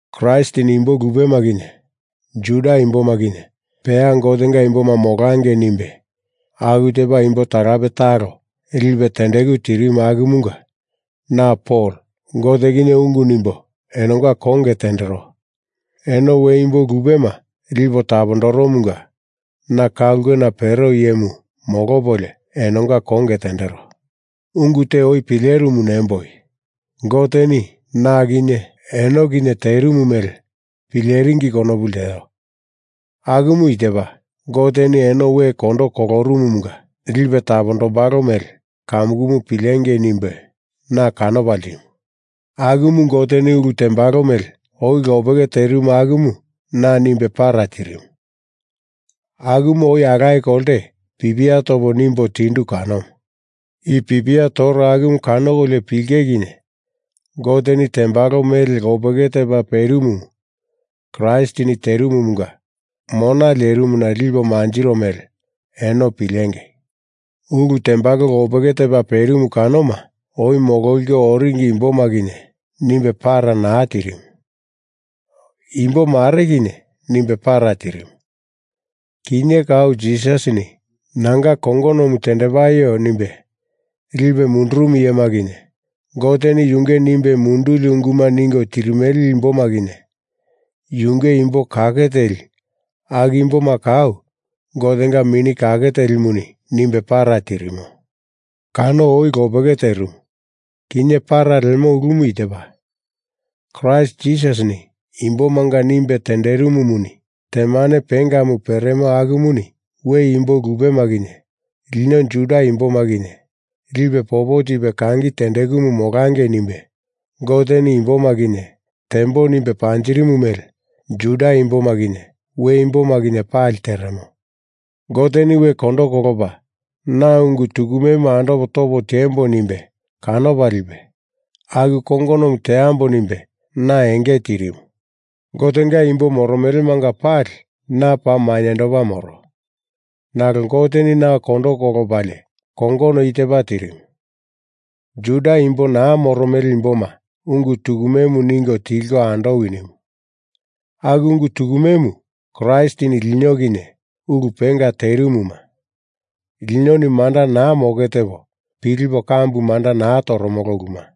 Kraistini imbo lupema kinye Juda imboma kinye peya Gotenga imboma molangei nimbe aku tepa imbo talape talo lipe tendeku tirimu akumunga na Pol Gote kinye ungu nimbo enonga konge tendero. Eno we imbo lupema lipo tapondoromunga na ka ulkena pero iyemu molopolio, enonga konge tendero. Ungu te oi pilerimu nemboi, Goteni na kinye eno kinye terimu mele pileringi konopu lteo. Akumu i tepa Goteni eno we kondo kolorumumunga lipe tapondombalo mele kamukumu pilengei nimbe na kanopa ltimu. Akumu Goteni ulu tembalo mele oi lopeke terimu akumu na nimbe para tirimu, akumu oi alaye kolte pipia topo nimbo tindu kanomu. I pipia toro akumu kanokolio pilenge kinye Goteni tembalo mele lopeke tepa perimumu Kraistini terimumunga mona lerimuna lipo manjiro mele eno pilenge. Ulu tembalo lopeke tepa perimu kanoma oi mololiko oringi imboma kinye nimbe para naa tirimu. Imbo mare, kinye nimbe para tirimu. Kinye kau Jisasini nanga kongonomu tendepaio nimbe lipe mundurumu iyema kinye, Goteni yunge nimbe munduli unguma ningo tirimele imboma kinye, yunge imbo kake teli aku imboma kau Gotenga Mini Kake Telimuni nimbe para tirimo. Kano oi lopeke terimu kinye para lemo ulumu i tepa, Kraist Jisasini imbomanga nimbe tenderimumuni temane pengamu peremo akumuni we imbo lupema kinye lino Juda imboma kinye lipe popo tipe kangi tendekumu molangei nimbe, Goteni imboma kinye tembo nimbe panjirimu mele Juda imboma kinye we imboma kinye pali teremo. Goteni we kondo kolopa na ungu tukumemu andopo topo tiembo nimbe kanopa lipe, aku kongonomu teambo nimbe na enge tirimu. Gotenga imbo moromelemanga pali na paa mainyendopa moro, nalo Goteni na we kondo kolopalie kongono i tepa tirimu, Juda imbo naa moromele imboma ungu tukumemu ningo tilko andowi nimu. Aku ungu tukumemu Kraistini lino kinye ulu penga terimuma, linoni manda naa moke tepo pilipo kambu manda naa toromolo uluma.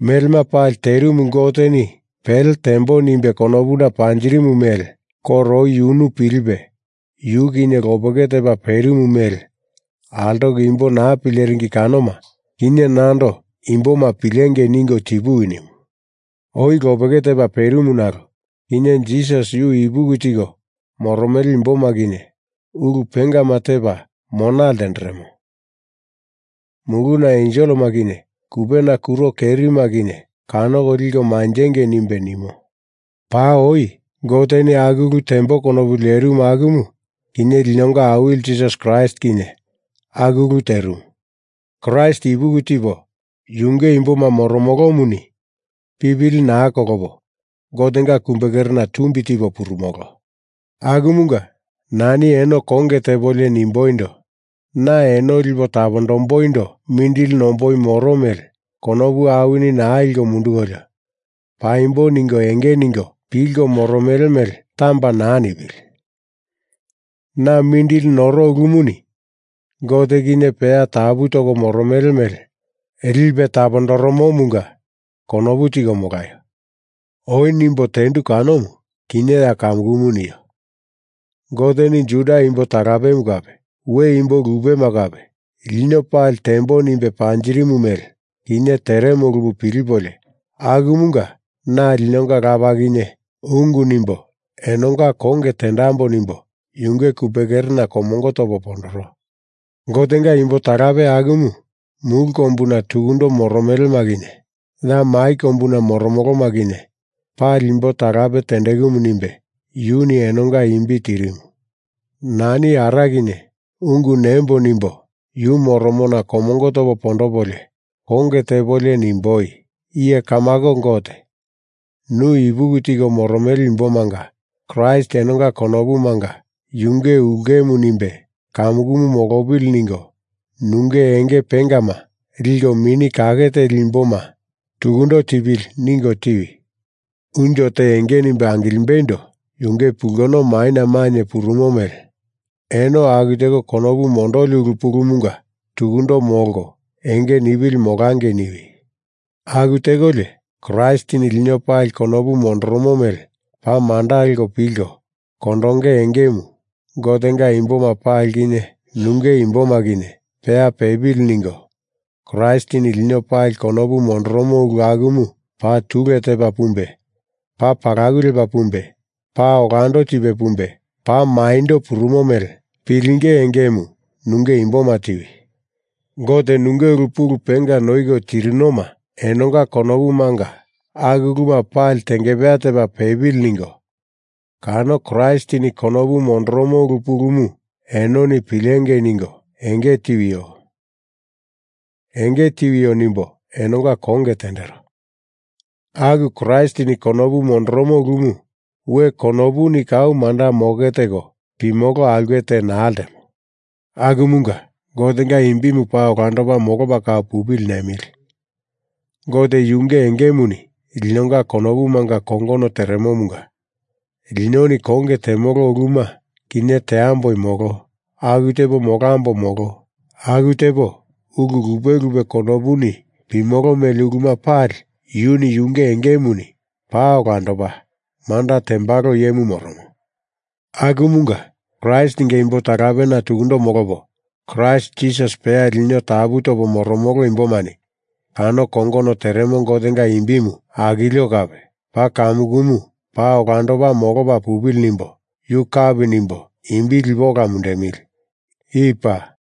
Melema pali terimu Goteni pele tembo nimbe konopuna panjirimu mele koro oi yunu pilipe yu kinye lopeke tepa perimu mele altoko imbo naa pileringi kanoma, kinye nando imboma pilengei ningo tipuwi nimu. Oi lopeke tepa perimu nalo kinye Jisasi yu ipuki tiko moromele imboma kinye ulu pengama tepa mona ltenderemo muluna enselema kinye kupena kuro kerima kinye kanoko liko manjengei nimbe nimo. Paa oi Goteni aku ulu tembo konopu lerimu akumu kinye linonga Awili Jisasi Kraist kinye aku ulu terimu. Kraist ipuki tipo yunge imboma moromolomuni pipili naa kolopo Gotenga kumbekerena tumbi tipo purumolo. Akumunga nani eno konge tepolio nimboindo, na eno lipo tapondomboindo mindili nomboi moro mele konopu awini naa liko mundukolio paimbo ningo enge ningo pilko moromele mele tamba naa nipili. Na mindili noro ulumuni Gote kinye peya tapu toko moromele mele lipe tapondoromomunga konopu tiko molaio. Oi nimbo tendu kanomu, kinye ya kamukumu nio. Goteni Juda imbo talapemu kape we imbo lupema kape lino pali tembo nimbe panjirimu mele kinye teremo ulumu pilipolio akumunga na linonga Lapa kinye ungu nimbo enonga konge tendambo nimbo yunge kumbekerena komongo topo pondoro. Gotenga imbo talape akumu mulu kombuna tukundo moromelema kinye, ya mai kombuna moromoloma kinye, pali imbo talape tendekumu nimbe yuni enonga imbi tirimu. Nani Ara kinye ungu nembo nimbo yu moromona komongo topo pondopolio konge tepolio nimboi. Iye Kamako Gote, nu ipuki tiko moromele imbomanga Kraist enonga konopumanga yunge ulkemu nimbe kamukumu molopili ningo nunge enge pengama liko Mini Kake Teli imboma tukundo tipili ningo tiwi. Unjo te enge nimbe angilimbeindo yunge pulkono maina mainye purumo mele eno aku teko konopu mondoli ulu pulumunga tukundo molko enge nipili molangei niwi. Aku tekolio Kraistini lino pali konopu mondoromo mele paa manda leko pilko kondonge engemu Gotenga imboma pali kinye nunge imboma kinye peya pepili ningo Kraistini lino pali konopu mondoromo ulu akumu paa tule tepa pumbe paa palaku lepa pumbe paa olando tipe pumbe paa maindo purumo mele pilinge engemu nunge imboma tiwi. Gote nunge ulu pulu penga noiko tirinoma enonga konopumanga aku uluma pali tengepeya tepa pepili ningo kano Kraistini konopu mondoromo ulu pulumu enoni pilengei ningo enge tiwio nimbo enonga konge tendero. Aku Kraistini konopu mondoromo ulumu we konopuni kau manda moke teko pimolo aulke te naa ltemo. Akumunga Gotenga imbimu paa olandopa molopa kau pupili nemili Gote yunge engemuni linonga konopumanga kongono teremomunga linoni konge temolo uluma kinye teamboi molo aku tepo molambo molo aku tepo ulu lupe lupe konopuni pimolo mele uluma pali yuni yunge engemuni paa olandopa manda tembalo iyemu moromo, akumunga Kraistinga imbo talapena tukundo molopo Kraist Jisasi peya lino tapu topo moromolo imbomani kano kongono teremo Gotenga imbimu akilio kape paa kamukumu paa olandopa molopa pupili nimbo yu kapi nimbo imbi lipo ola mundemili. I paa.